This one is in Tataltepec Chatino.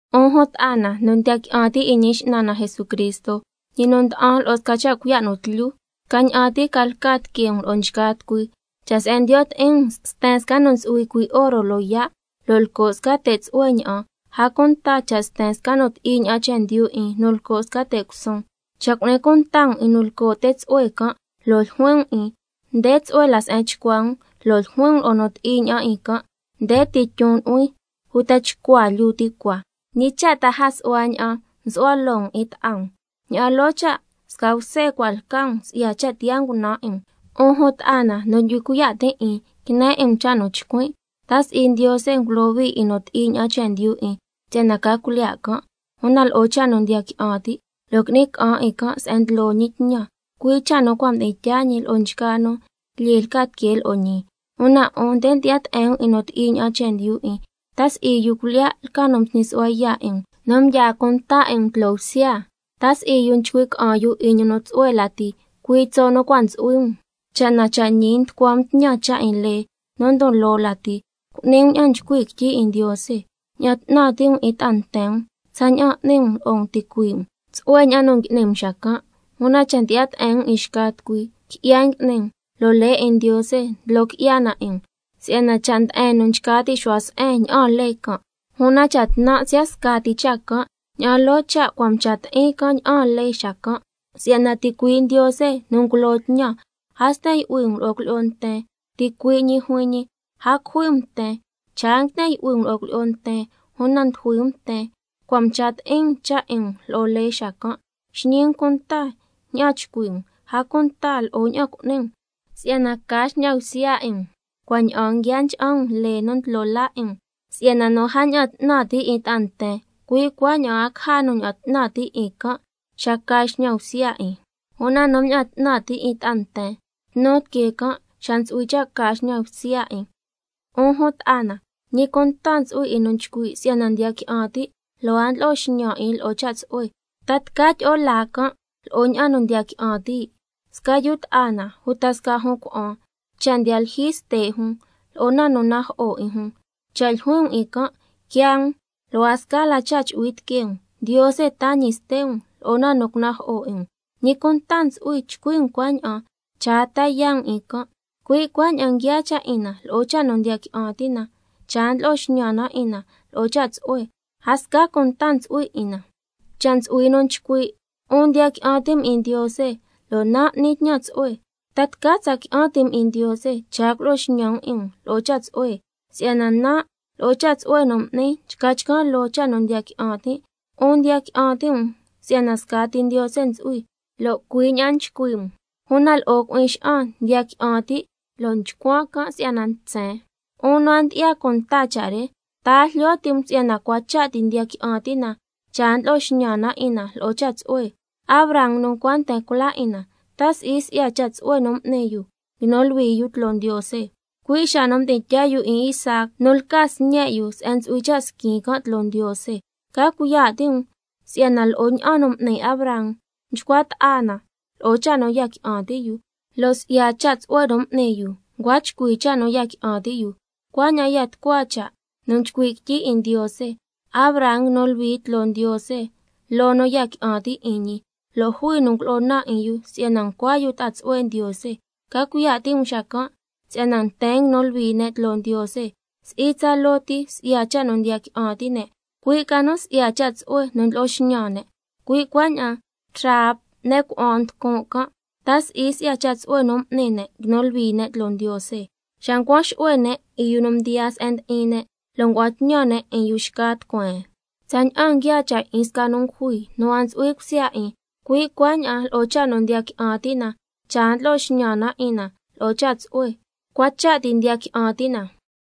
'Un jun ta'a na nu ndiya qui'an ti' 'in Ñi X'nan na Jesucristo, ñi nu nda'an lo'o sca cha' cuiya' nu tlyu, scaña'an ti ca lca tiquee um lo'o nchgaa tucui. Cha' se'en ndiyo' ti'in um sten sca nu ntsu'hui cuii' oro loyaa' lo' lco' sca te' tsu'hue ña'an, a cunta cha' sten sca nu ti'i ña'an chendyu 'in nu lco' sca te' cusun, cha' cu'ni cunta um 'in nu lco' te' tsu'hue can' lo' ljuin um 'in: Nde tsu'hue la se'en chcua um, lo' ljuin um lo'o nu ti'i ña'an 'in can': Nde ti tyon nu'huin uta chcua lyuu ti cua, ¿ñi cha' ta a su'hua ña'an nsu'hua loo um 'in ta'a um? Ña'an loo cha' sca bse cua' lca um si'ya cha' tiyaa ngunan' 'in um. 'Un jun ta'a na nu ndyu'hui cuiya' tin' 'in, quine 'in um cha' nu chcuin': ¿Ta si'i Ndiose ngulohui 'in nu ti'i ña'an chendyu 'in si'yana ca cuilyiya' can', una lo'o cha' nu ndiya qui'an ti', lo' qui'ni ca'an 'in can' se'en ndlo ñi tñan, cui' cha' nu cua' mdi'in tyaa ñi lo'o nchgaa nu lyee lca tiquee lo'o ñi? Una 'un nde ndyi'ya te'en um 'in nu ti'i ña'an chendyu 'in. ¿Ta si'i yu cuilyiya' lca nu nsñi su'hua yaa' 'in um nu ndyaa cunta 'in um tloo bsya? ¿Ta si'i yu nchcui' ca'an yu 'in ñi nu tsu'hue lati, cui' tso' nu cua' ntsu'hui um? Cha' na cha' ñi nducua um tñan cha' 'in lee nu ndon loo lati, cu'ni um ña'an nchcui' quityi 'in Ndiose: —Ña'an 'tnan ti' um 'in ta'a nten um tsaña'an n'ni um lo'o um ticuii' um—, tsu'hue ña'an nu ngui'ni um xacan'. Una cha' ndyi'ya te'en um 'in xca tucui, qui'ya ngui'ni um, lo' lee 'in Ndiose ndlo qui'ya na 'in um. Si'yana cha' nde'en nu nchca ti' xu'hua se'en ña'aan lee can', una cha' tnan' siya' scati cha' can', ña'an loo cha' cua' mcha ti'in can' ña'aan lee xacan'. Si'yana ticui' Ndiose nu ngulo tñan: —A sten yu'hui um lo'o cuilyi'o nten—, ticui' ñi juin ñi: —A cujui um nten—. Cha' a nguiten yu'hui um lo'o cuilyi'o nten, una ndujui um nten, cua' mcha ti'in um cha' 'in um lo'o lee xacan'. Xñi um cunta ña'an chcui' um, a cunta lo'o ña'an cu'ni um, si'yana ca xñan bsya 'in um cua' ña'aan nguia ncha'an um lee nu ndlo laa 'in um. Si'yana nu a mña'an 'tnan ti' 'in ta'a nten, cui' cuaña'an a caja nu ña'an 'tnan ti' 'in can' xa ca xñan bsya 'in, una nu mña'an 'tnan ti' 'in ta'a nten, tnu tiquee can' xa ntsu'hui cha' ca xñan bsya 'in. 'Un jun ta'a na, ¿ñi cunta ntsu'hui 'in nu nchcui' si'yana ndiya qui'an ti' lo' a ndlo'o xñan 'in lo'o cha' tsu'hue? ¿Ta tca tyi'o laa can' lo'o ña'an nu ndiya qui'an ti'? Sca yu ta'a na uta sca jun cuna'an cha' ndiyaa lyijyi ste' jun, lo'o na nu najo'o 'in jun, cha' ljuin um 'in can': Quiaa um, lo' a sca la cha' chu'hui tiquee um, Ndiose taa ñi ste' um lo'o na nu cunajo'o 'in um, ¿ñi cunta ntsu'hui chcui' um cuaña'an cha' a ta yaa' um 'in can'? Cui' cuaña'an nguiaa cha' 'in na lo'o cha' nu ndiya qui'an ti' na, cha' a ndlo'o xñan na 'in na lo'o cha' tsu'hue, a sca cunta ntsu'hui 'in na. Cha' ntsu'hui nu chcui': 'Un ndiya qui'an ti' um 'in Ndiose, lo' nan' n'nin tñan tsu'hue, ¿ta tca tsa qui'an ti' um 'in Ndiose, cha' a culo'o xñan um 'in um lo'o cha' tsu'hue? Si'yana nan' lo'o cha' tsu'hue nu n'nin nchca chcan' loo cha' nu ndiya qui'an tin'. 'Un ndiya qui'an ti' um si'yana scati Ndiose ntsu'hui, lo' cui' ña'an nchcui' um, una lo'o cui'in xa'an ndiya qui'an ti' lo' nchcuan can' si'yana ntsen. 'Un nu a ndyi'ya cunta cha' re, ¿ta a jlyo ti' um si'yana cua cha' ti ndiya qui'an ti' na, cha' a ndlo'o xñan na 'in na lo'o cha' tsu'hue? Abraham nu ncua nten cula 'in na, ¿ta si'i si'ya cha' tsu'hue nu m'ni yu nguinu luhui yu tloo Ndiose, cui' xa nu mdi'in tyaa yu 'in Isaac nu lca sñe' yu se'en ntsu'hui cha' squin can' tloo Ndiose? Ca cuiya' ti' um si'yana lo'o ña'an nu m'ni Abraham, mchcua ta'a na lo'o cha' nu ya qui'an ti' yu, lo' si'ya cha' tsu'hue nu m'ni yu ncua chcui cha' nu ya qui'an ti' yu. Cuaña'an ya tucua cha' nu nchcui' quityi 'in Ndiose: —Abraham nguinu luhui tloo Ndiose loo nu ya qui'an ti' 'in ñi—, lo' jui nu ngulo'o naan 'in yu si'yana ncua yu ta'a tsu'hue Ndiose. Ca cuiya' ti' um xacan' si'yana nten nguinu luhui ne' tloo Ndiose, si'i tsaloo ti si'ya cha' nu ndiya qui'an ti' ne', cui' ca nu si'ya cha' tsu'hue nu ndlo'o xñan ne'. Cui' cuaña'an Rahab ne' cuna'an nducun' can', ¿ta si'i si'ya cha' tsu'hue nu m'ni ne' nguinu luhui ne' tloo Ndiose, xa ncuan xu'hue ne' 'in yu nu mdiyaa se'en ndi'in ne' lo' ngua'an tñan ne' 'in yu xca tucueen? Tsaña'an nguiaa cha' 'in sca nu ngujui nu a ntsu'hui cusya 'in, cui' cuaña'an lo'o cha' nu ndiya qui'an ti' na cha' a ndlo'o xñan na 'in na lo'o cha' tsu'hue, cua cha' ti ndiya qui'an ti' na.